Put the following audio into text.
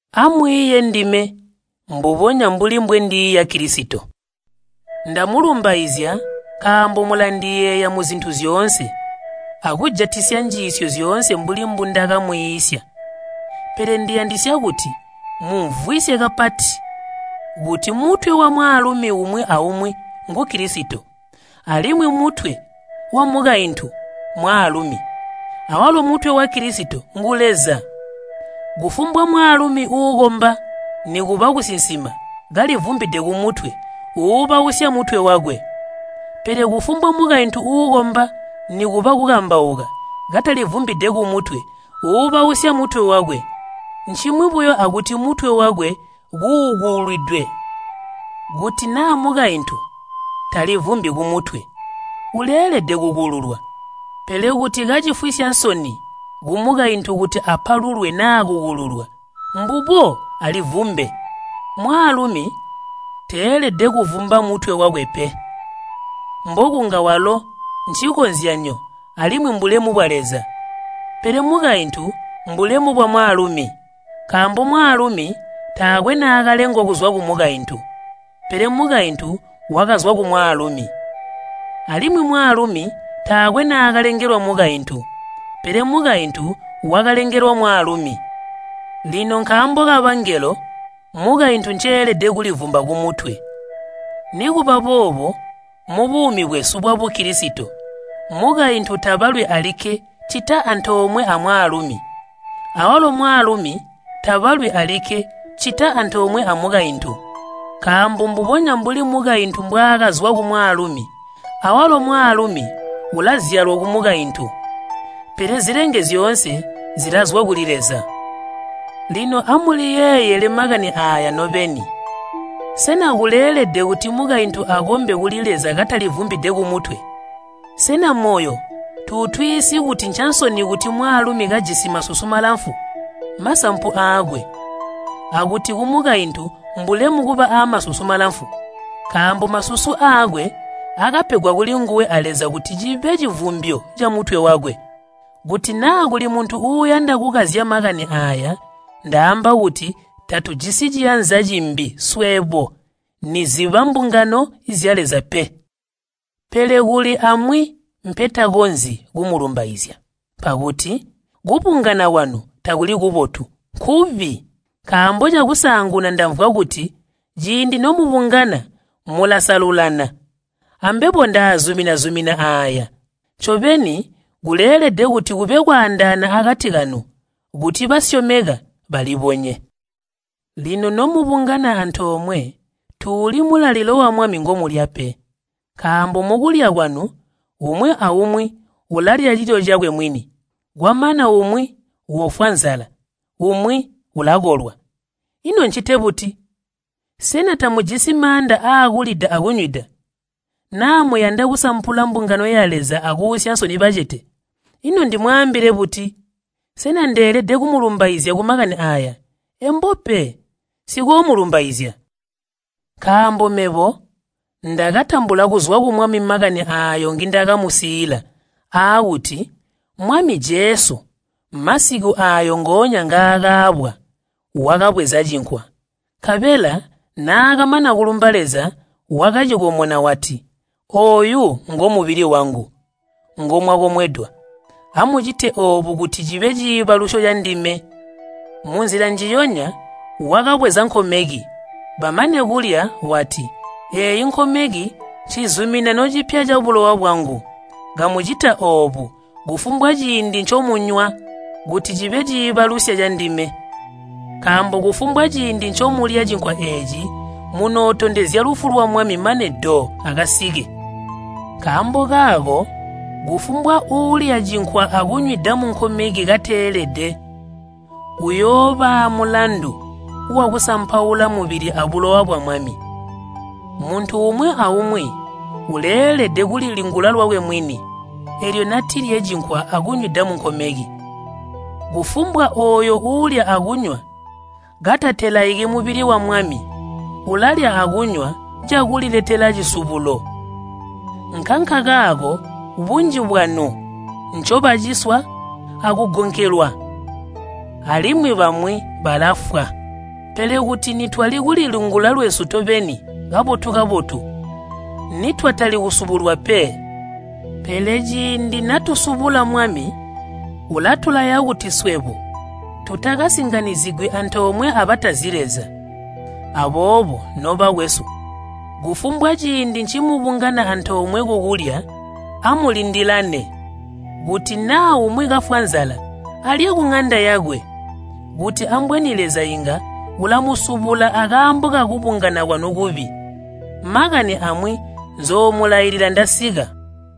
Amwiiye ndime mbubonya mbuli mbwendiiya Kilisito. Ndamulumbaizya nkaambo mulandiyeeya muzintu zyoonse, akujatisya njiisyo zyoonse mbuli mbundakamwiisya. Pele ndiyandisya kuti mumvwisye kapati kuti mutwe wamwaalumi umwi aumwi ngu Kilisito, alimwi mutwe wamukaintu mwaalumi, awalo mutwe wa Kilisito ngu Leza. Kufumbwa mwaalumi uukomba nikuba kusinsima kalivumbide kumutwe uubausya mutwe wakwe. Pele kufumbwa mukaintu uukomba nikuba kukambauka katalivumbide kumutwe uubausya mutwe wakwe, ncimwi buyo akuti mutwe wakwe kuukulwidwe. Kuti naa mukaintu talivumbi kumutwe, uleelede kukululwa. Pele kuti kacifwisya nsoni kumukaintu kuti apalulwe naa kukululwa, mbubo alivumbe. Mwaalumi teelede kuvumba mutwe wakwe pe, mbokunga walo ncikozyanyo alimwi mbulemu bwa Leza, pele mukaintu mbulemu bwamwaalumi. Nkaambo mwaalumi taakwe naakalengwa kuzwa kumukaintu, pele mukaintu wakazwa kumwaalumi. Alimwi mwaalumi taakwe naakalengelwa mukaintu, pele mukaintu wakalengelwa mwaalumi. Lino nkaambo kabangelo mukaintu nceelede kulivumba kumutwe. Nikuba boobo mubuumi bwesu bwa Bukilisito, mukaintu tabalwi alikke ccita antoomwe amwaalumi, awalo mwaalumi tabalwi alikke ccita antoomwe amukaintu. Nkaambo mbubonya mbuli mukaintu mbwaakazwa kumwaalumi, awalo mwaalumi ulazyalwa kumukaintu. Pele zilenge zyoonse zilazwa kuli Leza. Lino amuliyeeyele makani aaya nobeni, sena kuleelede kuti mukaintu akombe kuli Leza katalivumbide kumutwe? Sena moyo tutwiisyi kuti ncansoni kuti mwaalumi kajisi masusu malamfu, masampu aakwe, akuti kumukaintu mbulemu kuba amasusu malamfu? Nkaambo masusu aakwe akapegwa kulinguwe a Leza kuti cibe civumbyo camutwe wakwe. Kuti naa kuli muntu uuyanda kukazya makani aaya, ndaamba kuti tatujisi ciyanza cimbi swebo niziba mbungano zya Leza pe. Pele kuli amwi mpetakonzyi kumulumbaizya. Mpakuti kubungana kwanu takuli kubotu, nkubi. Nkaambo cakusaanguna ndamvwa kuti ciindi nomubungana mulasalulana, ambebo ndaazumina-zumina aaya. Ncobeni kuleelede kuti kube kwaandaana akati kanu kuti basyomeka balibonye. Lino nomubungana antoomwe, tuuli mulalilo wa Mwami ngomulya pe. Nkaambo mukulya kwanu umwi aumwi ulalya cilyo cakwe mwini, kwamana umwi ufwa nzala, umwi ulakolwa. Ino ncite buti? Sena tamujisi maanda aakulida akunywida? Naa muyanda kusampula mbungano ya Leza akuusya nsoni bacete? Ino ndimwaambile buti? Sena ndeelede kumulumbaizya kumakani aaya? Embo pe, nsikoomulumbaizya. Nkaambo mebo ndakatambula kuzwa ku Mwami makani aayo ngindakamusiila, aakuti Mwami Jesu masiku aayo ngoonya ngaakaabwa, wakabweza cinkwa, nkabela naakamana kulumba Leza, wakacikomona wati, “Ooyu ngomubili wangu ngomwakomwedwa. Amucite oobu kuti cibe ciibalusyo candime.” Munzila njiyonya wakabweza nkomeki, bamane kulya, wati, “Eeyi nkomeki ncizuminano cipya cabulowa bwangu. Kamucita oobo, kufumbwa ciindi ncomunywa, kuti cibe ciibalusya candime.” Nkaambo kufumbwa ciindi ncomulya cinkwa eeci munootondezya lufu lwa Mwami mane do akasike. Nkaambo kaako kufumbwa uulya cinkwa akunywida munkomeki kateelede, uyoobaa mulandu wakusampaula mubili abulowa bwa Mwami. Muntu umwi aumwi uleelede kulilingula lwakwe mwini, eelyo natilye cinkwa akunywida munkomeki. Kufumbwa ooyo uulya akunywa katatelaiki mubili wa Mwami, ulalya akunywa cakuliletela cisubulo. Nkankakaako bunji bwanu ncobaciswa akugonkelwa, alimwi bamwi balafwa. Pele kuti nitwali kulilingula lwesu tobeni kabotu-kabotu, nitwatali kusubulwa pe. Pele ciindi natusubula Mwami ulatulaya kuti swebo tutakasinganyizigwi antoomwe abatazi Leza. Aboobo, nobakwesu, kufumbwa ciindi ncimubungana antoomwe kukulya, amulindilane, kuti naa umwi kafwa nzala alye kuŋanda yakwe, kuti ambweni Leza inga ulamusubula akaambo kakubungana kwanu kubi. Makani amwi nzoomulailila ndasika.